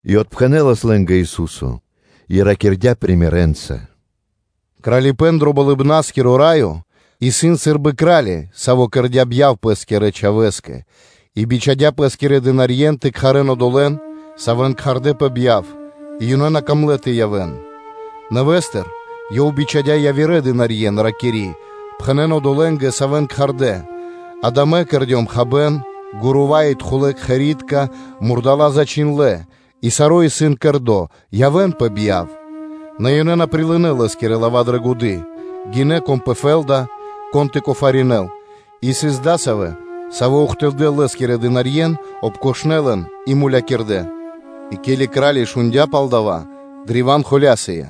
И отпхэнэ́лас лэ́нгэ Ису́со и ракирдя́ сыкаибнэнца: “Кралипэ́н дро Болыбна́скиро Раё исын сы́рбы кра́ли, саво́ кэрдя́ бьяв пэ́скирэ чхавэ́скэ, и бичхадя́ пэ́скирэ дынарье́н тэ кхарэ́н одолэ́н, савэ́н кхардэ́ пэ бьяв: и ёнэ на камлэ́ тэ явэ́н. Нэвэ́стыр ёв бичхадя́ явирэ дынарье́н, ракири́: ‘Пхэнэ́н одолэ́нгэ, савэ́н кхардэ́: акэ мэ кэрдём хабэ́н; гурува и тхулэ кхэри́тка мурдала́ зачхиндлэ́, и саро́ исын кэрдо́, явэ́н пэ бьяв.’ Нэ ёнэ на прилынэ́ лэ́скирэ лава́ дрэ годы́, гинэ́, кон пэ фэ́лда, кон тэ кофаринэл; и сыс адасавэ́, савэ́ ухтылдэ́ лэ́скирэ дынарье́н, ладжакирдэ́ лэн и мулякирдэ́,. И ке́ли кра́ли шундя́ пал дава́, древа́н холя́сыя,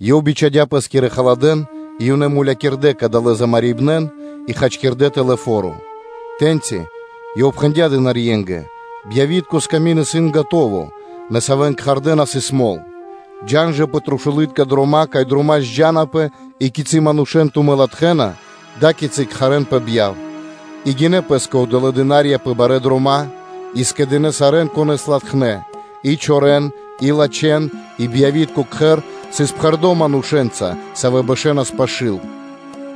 и ёв бичхадя́ пэ́скирэ халадэ́н и ёнэ мулякирдэ́ кадалэ́ замарибнарьен и хачкирдэ́ тэлэ́ фо́ро. Тэ́ньци ёв пхэндя́ дынарье́нгэ: ‘Бьявитко сками́нд исын скэдыно́, нэ савэ́н кхардэ́, на сыс мол; джа́н жэ пэ трушулытка дрома́, кай дрома́ зджанапэ, и кицы́ манушэ́н тумэ́ латхэ́на, ада́кицы кхарэ́н пэ бьяв.’ И гинэ́ пэ́скэ одолэ́ дына́рья пэ барэ́ дрома́ и скэдынэ́ сарэ́н, конэ́с латхнэ́: и чорэн и лачхэн; и бьявитко кхэр сыс пхэрдо́ манушэ́нца, савэ́ бэшэнас пашы́л.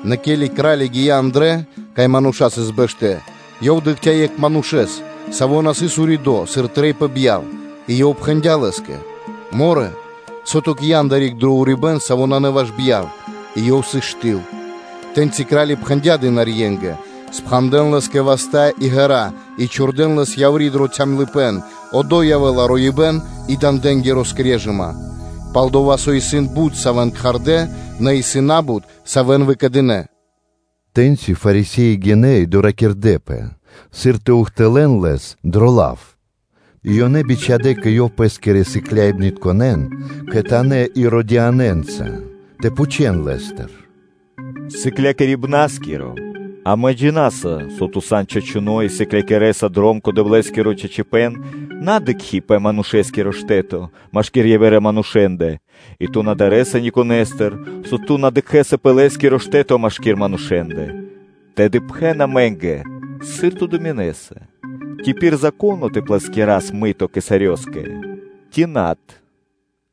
Нэ ке́ли кра́ли гия́ андрэ́, кай мануша́ сыс бэштэ́, ёв дыкхця́ екхэ манушэ́с, саво́ на сыс уридо́, сыр трэй пэ бьяв, и ёв пхэндя́ лэ́скэ: ‘Морэ? Сыр ту ги́ян адари́к дро урибэ́н, со исын на ваш бьяв?’ И ёв сыс штыл. Тэ́ньци кра́ли пхэндя́ дынарье́нгэ: ‘Пхандэн лэ́скэ васта́ и ґэра́, и чхурдэ́н лэс яври́ дро цямлыпэ́н (калыпэн), одо́й явэ́ла роибэ́н и дандэнгири скрежыма.’ Пал-дова́ со исын бут, савэ́н кхардэ́, нэ исын на́бут, савэ́н выкэдынэ́.” Тэ́ньци Фарисе́и гинэ́ и доракирдэпэ, сыр тэ ухтылэ́н Лэс дро лав. И ёнэ бичхадэ́ кэ Ёв пэ́скирэ сыкляибнытконэ́н кхэтанэ́ Иродианэнца тэ пхучэ́н Лэ́стыр: “Сыклякирибна́скиро! Амэ джина́са, со Ту сан чачуно́ и сыклякирэса пал дром кэ Дэвлэ́скиро чачипэ́н, на дыкхи́ пэ манушэ́скиро штэ́то машки́р явирэ манушэ́ндэ, и Ту на дарэса никонэстыр, со Ту на дыкхэ́са пэ лэ́скиро штэ́то машки́р манушэ́ндэ; тэды пхэн амэ́нгэ, сыр Ту думинэса: ци исын пир Зако́но тэ плэскирас намирья (подать) кесарёскэ ци над?”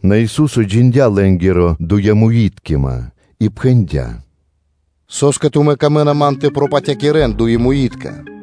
Нэ Ису́со джиндя́ лэ́нгири дуемуиткима и пхэндя́: “Со́скэ тумэ́ Ман камэ́на тэ пропатякирэн, дуемуитка?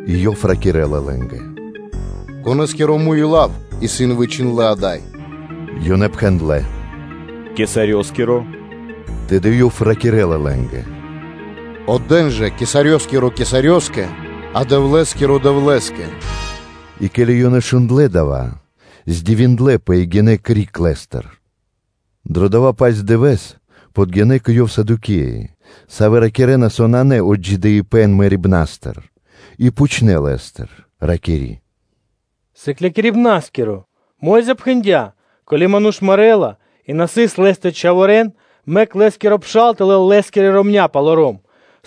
И Ёв ракирэ́ла лэ́нгэ: “Конэ́скиро муй и лав исын вычхиндлэ́ ада́й?” Ёнэ пхэндлэ́: “Кесарёскиро.” Тэды Ёв ракирэ́ла лэ́нгэ: “Отдэ́н жэ кесарёскиро Кесарёскэ, а Дэвлэ́скиро Дэвлэ́скэ.” И ке́ли ёнэ шундлэ́ дава́, дынэпэ дивоскэ и гинэ́ криг Лэ́стыр. Дро дова́-паць дывэ́с подгинэ́ кэ Ёв Садукеи, савэ́ ракирэ́на, со нанэ отджидыипэн мэрибна́стыр, и пхучнэ́ Лэ́стыр, ракири́: “Сыклякирибна́скиро! Мо́йза (Моисеё) пхэндя́: ‘Ко́ли ману́ш мэрэ́ла, и на сыс лэ́стэ чхаворэ́н, мэк лэ́скиро пшал тэ лэл лэ́скирэ ромня́ палоро́м,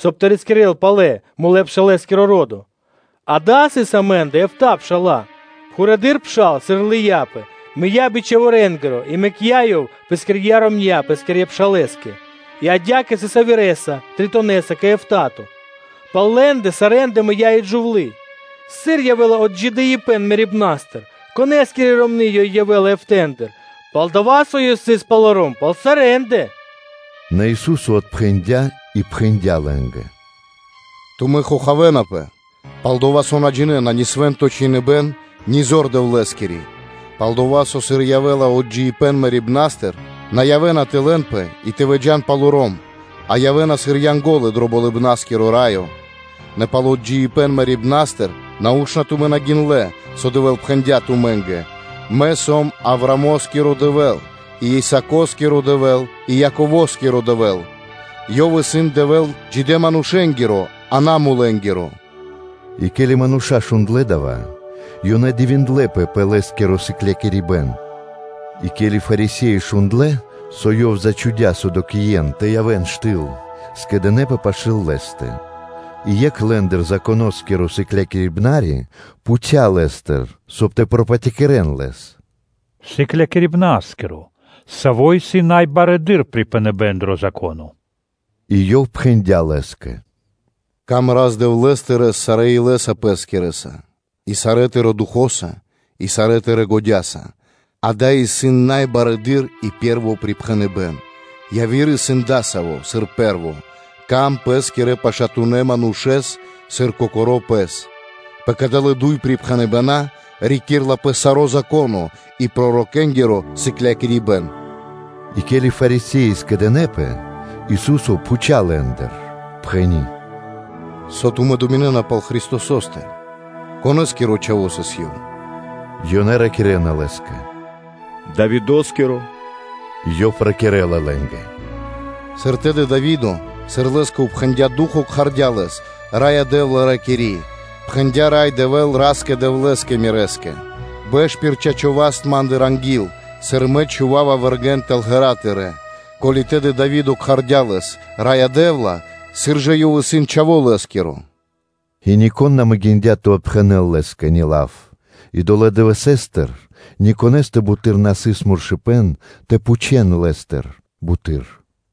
соб (кай) тэ рискирэ́л палэ мулэ́-пшалэскиро ро́до.’ Акэ, сыс амэ́ндэ эфта́ пша́ла: пхурэды́р пшал сыр лыяпэ, мыя́ би чхаворэнгиро и мэкця́ ёв пэскирья́ ромня́ пэ́скирэ пшалэ́скэ; и адя́кэ сыс явирэса, тритонэса кэ эфта́то. Пал лэ́ндэ сарэ́ндэ и мыя́ джувлы́. Сыр явэ́ла отджидыипэн мэрибна́стыр, конэ́скири ромны́ ёй явэ́ла эфтандыр? Пал-дова́ со ёй сыс палоро́м пал сарэ́ндэ.” Нэ Ису́со отпхэндя́ и пхэндя́ лэ́нгэ: “Тумэ́ дэнапэ дукха́, пал-дова́ со на джинэ́на ни Свэ́нто Чхиныбэ́н, ни зор Дэвлэ́скири. Пал-дова́ со, сыр явэ́ла отджидыипэн мэрибна́стыр, на явэ́на тэ лэнпэ и тэ выджа́н палоро́м, а явэ́на сыр Янго́лы дро Болыбна́скиро Раё. Нэ пал отджидыипэн мэрибна́стыр, нау́што тумэ́ на гиндлэ́, со Дэвэ́л пхэндя́ тумэ́нгэ: ‘Мэ сом Аврамоскиро Дэвэ́л, и Исако́скиро Дэвэ́л, и Яково́скиро Дэвэ́л’? Ёв исын Дэвэ́л джидэ́-манушэ́нгиро, а на мулэнгиро.” И ке́ли мануша́ шундлэ́ дава́, ёнэ дивиндлэ́пэ пэ Лэ́скиро сыклякирибэ́н. И ке́ли Фарисе́и шундлэ́, со Ёв зачхудя Садукеен тэ явэ́н штыл (ти́ха), скэдынэ́пэ пашы́л Лэ́стэ. И екх лэ́ндыр, Законоскиро сыклякирибнари, пхуця́ Лэ́стыр, соб (кай) тэ пропатякирэн Лэс: “Сыклякирибна́скиро, саво́ исын най барэды́р припхэныбэ́н дро Зако́но?” И Ёв пхэндя́ лэ́скэ: “Рикир сыр Дро́гима Рас-Дэвлэ́с тырэ́с сарэ́ илэ́са пэскирэса и сарэ́ тырэ́ духо́са, и сарэ́ тырэ́ годя́са.” Дава́ исын най барэды́р и пэ́рво припхэныбэ́н. Яви́р исын дасаво сыр пэ́рво: ‘Сыка́в паты́в пэ́скирэ пашатунэ́ манушэ́скэ сыр кокоро́ пэ́скэ.’ Пэ кадалэ́ дуй припхэныбэна́ рикирэ́лапэ саро́ Зако́но и пророкэнгиро сыклякирибэ́н.” И ке́ли Фарисе́и скэдынэ́пэ, Ису́со пхуця́ лэ́ндыр: пхэни́: “Со тумэ́ думинэ́на пал Христосо́стэ? Конэ́скиро Чхаво́ исын Ёв?” Ёнэ ракирэ́на Лэ́скэ: “Давидо́скиро.” Ёв ракирэ́ла лэ́нгэ: “Сыр тэды Дави́до, сыр лэ́скэ упхэндя Ду́хо (Фа́но), кхардя́ Лэс’ Раё Дэ́вла’, ракири́: ‘Пхэндя Рай Дэвэ́л Ра́скэ-Дэвлэ́скэ мирэ́скэ: ‘Бэш пир чачо́ васт Ма́ндыр, анги́л, сыр Мэ чхува́ва вэргэ́н тэл ґэра́ Тырэ́?’ Ко́ли тэды Дави́до кхардя́ Лэс ‘Раё Дэ́вла’, сыр жа Ёв исын чхаво́ лэ́скиро?” И нико́н на могиндя́ тэ отпхэнэл Лэ́скэ ни лав, и долэ́ дывэсэ́стыр никонэстэ буты́р на сыс муршыпэн тэ пхучэл Лэ́стыр буты́р.